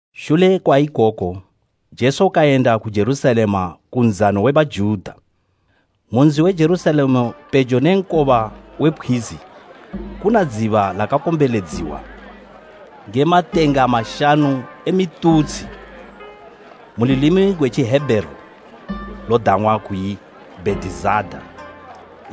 Shule kwa ikoku Jesu kayenda ku Jerusalema ku nzano we Bajuta. Mu nzi we Jerusalema pejo ne nkoba we pkhwizi kuna dziba lakakombeledziwa nge matenga mashanu e mitutshi, mu lulimi gwe Tjihebheru lodang'wa kuyi Bhetizada. Bhetizada: Kene “Bhetisaida.”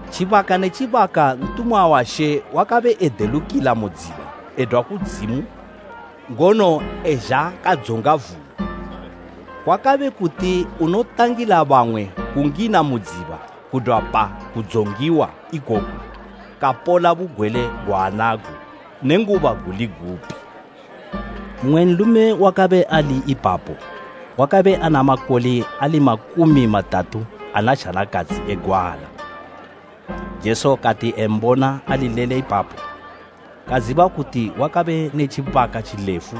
Tjibaka ne tjibaka, ntumwa wa She wakabe edelukila mu dziba edwa kudzimu ngono ezha kadzonga vula. Kwakabe kuti unotangila bamwe kungina mu dziba kudwa pa kudzongiwa ikoku, kapola bugwele gwaanago nenguba guli gupi.” Mmwe nlume wakabe ali ipapo wakabe ana makole ali makumi matatu ana zhanakadzi egwala. Jesu kati embona alilele ipapo, kaziba kuti wakabe ne tjibaka tjilefu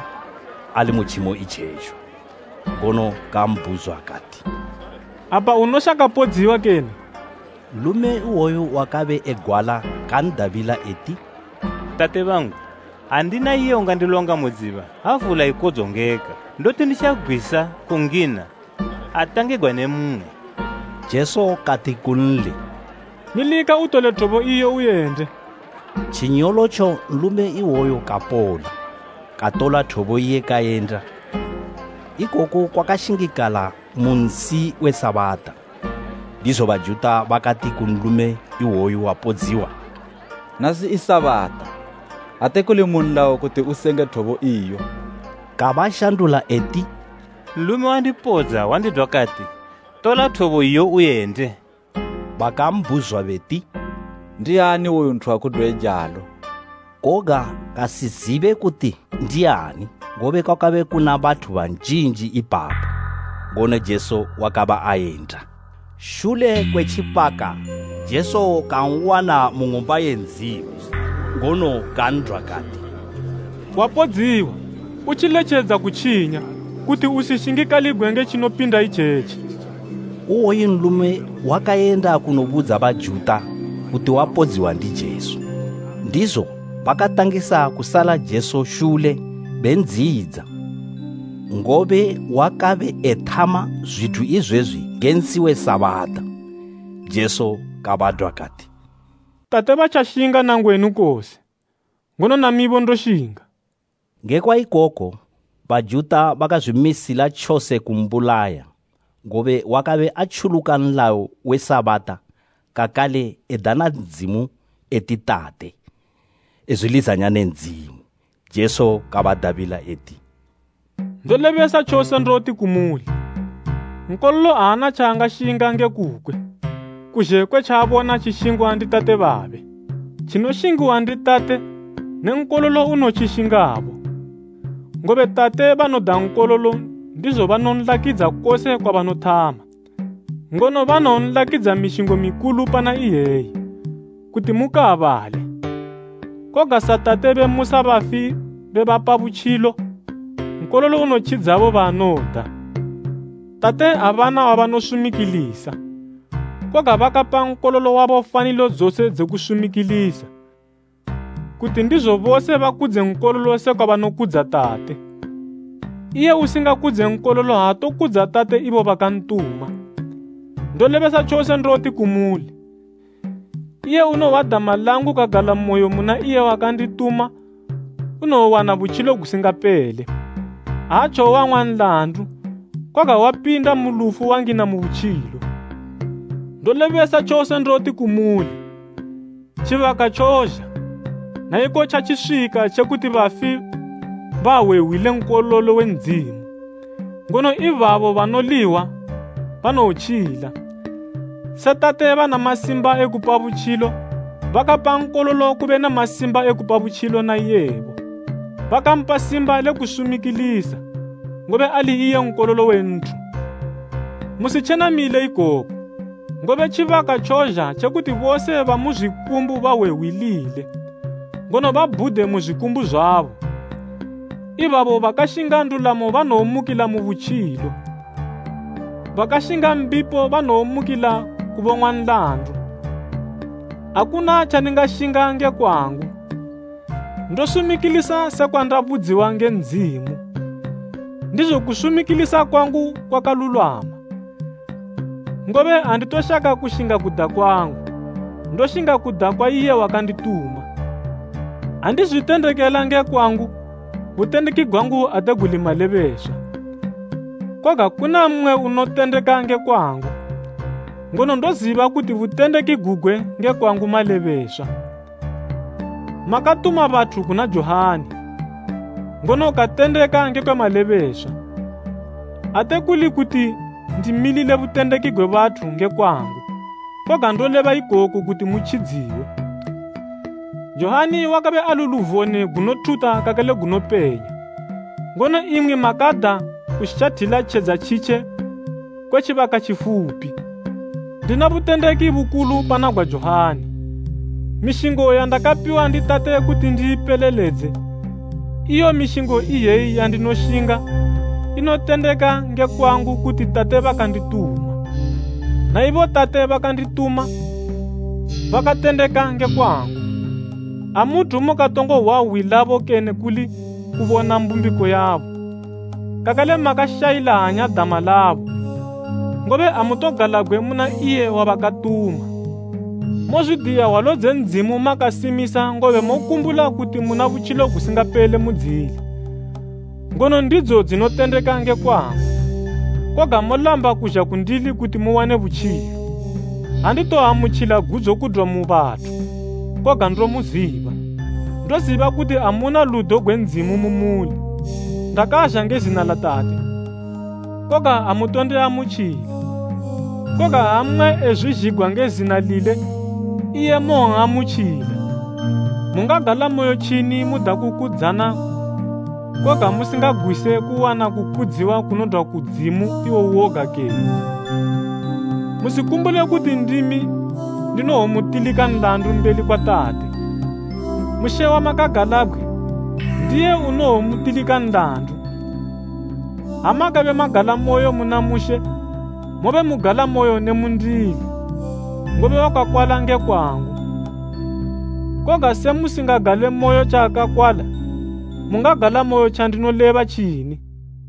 ali mu tjimo itjetjo, ngono kambhuzwa kati, “Apa unoshaka podziwa kene?” Nlume iwoyu wakabe egwala kan'dabila eti, “Tate bangu, andina iye ungandilonga mu dziba ha vula ikodzongeka, ndoti nditjagwisa kungina, atangigwa ne mmwe.” Jesu kati kunli, “Milika utole thobo iyo uyende.” Tjinyolotjo nlume iwoyu kapola, katola thobo iye kayenda. Ikoku kwakashingikala mu nsi we Sabata. Ndizo Bajuta bakati ku nlume iwoyu wapodziwa, “Nasi i Sabata, ate kuli mu nlayo kuti usenge thobo iyo.” Kabashandula eti, “Nlume wandipodza wandidwa kati, ‘Tola thobo iyo uyende.’” Bakambhuzwa beti, “Ndiani iwoyo nthu wakudwa eijalo?” Koga kasizibe kuti ndiani, ngobe kwakabe kuna bathu banjinji ipapo, ngono Jesu wakabe ayenda. Shule kwe tjibaka Jesu kan'wana mu Ng'umba ye Ndzimu, ngono kan'dwa kati “Wapodziwa, utjiletjedza kutjinya, kuti usishingikaligwe nge tjinopinda itjetji.” Iwoyu nlume kayenda kanobudza Bajuta kuti wapodziwa ndi Jesu. Ndizo bakatangisa kusala Jesu shule bendziyidza, ngobe wakabe ethama zwithu izwezwi nge nsi we Sabata. Jesu kabadwa kati, “Tate batjashinga na ngwenu kose, ngono namibo ndoshinga.” Ngekwa ikoku Bajuta bakazwimisila tjose kumbulaya, ngobe wakabe atjuluka nlayo we Sabata kakale edana Ndzimu eti Tate, ezwilizanya ne Ndzimu. Jesu kabadabila eti, “Ndolebesa tjose ndoti kumuli, Nkololo aana tjaangashinga nge kukwe, kuzhe kwe tjaabona tjishingwa ndi Tate babe. Tjinoshingiwa ndi Tate ne Nkololo unotjishingabo. Ngobe Tate banoda Nkololo ndizo banonlakidza kose kwabanothama; ngono banowonlakidza mishingo mikulu pana iyeyi, kuti mukaabale. Koga sa Tate bemusa bafi bebapa butjilo, Nkololo unotjidzabo baanoda. Tate abana wabanosumikilisa, koga bakapa Nkololo wabo fanilo dzose dze kusumikilisa, kuti ndizo bose bakudze Nkololo sekwa banokudza Tate. Iye usingakudze Nkololo aatokudza Tate ibo bakantuma. “Ndolebesa tjose ndoti kumuli, iye unohwa dama langu kagalamoyo muna iye wakandituma, unowowana butjilo gusingapele. Aatjowowang'wa nlandu, koga wapinda mu lufu wangina mu butjilo. Ndolebesa tjose ndoti kumuli, tjibaka tjozha, na iko tjatjiswika tje kuti bafi bahwe hwi le Nkololo we Ndzimu, ngono ibabo banowolihwa banowotjila. Se Tate bana masimba ekupa butjilo, bakapa Nkololo kube ne masimba ekupa butjilo na iyebo. Bakampa simba le kusumikilisa, ngobe ali iye Nkololo we nthu. Musitjenamile ikoku, ngobe tjibaka tjozha tje kuti bose bamu zwikumbu bahwe hwi lile, ngono babhude mu zwikumbu zwabo, ibabo bakashinga ndulamo banowomukila mu butjilo, bakashinga mbipo banowomukila kubong'wa nlandu. “Akuna tjandingashinga nge kwangu, ndosumikilisa sekwa ndabudziwa nge Ndzimu, ndizo kusumikilisa kwangu kwakalulwama, ngobe anditoshaka kushinga kuda kwangu, ndoshinga kuda kwa iye wakandituma. “Ha ndizwitendekela nge kwangu, butendeki gwangu ate guli malebeswa. Koga kuna mmwe unotendeka nge kwangu, ngono ndoziba kuti butendeki gugwe nge kwangu malebeswa. Makatuma bathu kuna Johani, ngono katendeka ngekwe malebeswa. Ate kuli kuti ndimilile butendeki gwe bathu nge kwangu koga, ndoleba ikoku kuti mutjidziwe. Johani wakabe ali luvone gunothuta kakale gunopenya, ngono imwi makada kushathila tjedza tjitje kwe tjibaka tjifupi. Ndina butendeki bukulu pana gwa Johani. Mishingo yandakapiwa ndi Tate kuti ndiipeleledze, iyo mishingo iyeyi yandinoshinga, inotendeka nge kwangu kuti Tate bakandituma. Na ibo Tate bakandituma, bakatendeka nge kwangu. Amuthu mukatongo hwa hwi labo kene kuli kubona mbumbiko yabo, kakale makashayila hanya dama labo, ngobe amutogalabgwe muna iye wabakatuma. Mozwidiya hwalo dze Ndzimu makasimisa ngobe mokumbula kuti muna butjilo gusingapele mudzili. Ngono ndidzo dzinotendeka nge kwangu, koga molamba kuzha kundili kuti muwane butjilo. “Anditoamutjila gudzo kudwa mu bathu, koga ndomuziba. Ndoziba kuti amuna ludo gwe Ndzimu mu muli. Ndakazha nge zina la Tate, koga amutondiamutjila; koga ha mmwe ezwizhigwa nge zina lile, iye mowon'amutjila. Mungagalamoyo tjini muda kukudzana, koga musingagwise kuwana kukudziwa kunodwa ku Ndzimu, iwo uwoga kene? Musikumbule kuti ndimi ndinowomutilika nlandu mbeli kwa Tate. Mushe wamakagalabgwe, ndiye unowomutilika nlandu. Ha makabe magalamoyo muna Mushe, mobe mugalamoyo ne mundili, ngobe wakakwala nge kwangu. Koga se musingagalemoyo tjaakakwala, mungagalamoyo tjandinoleba tjini?”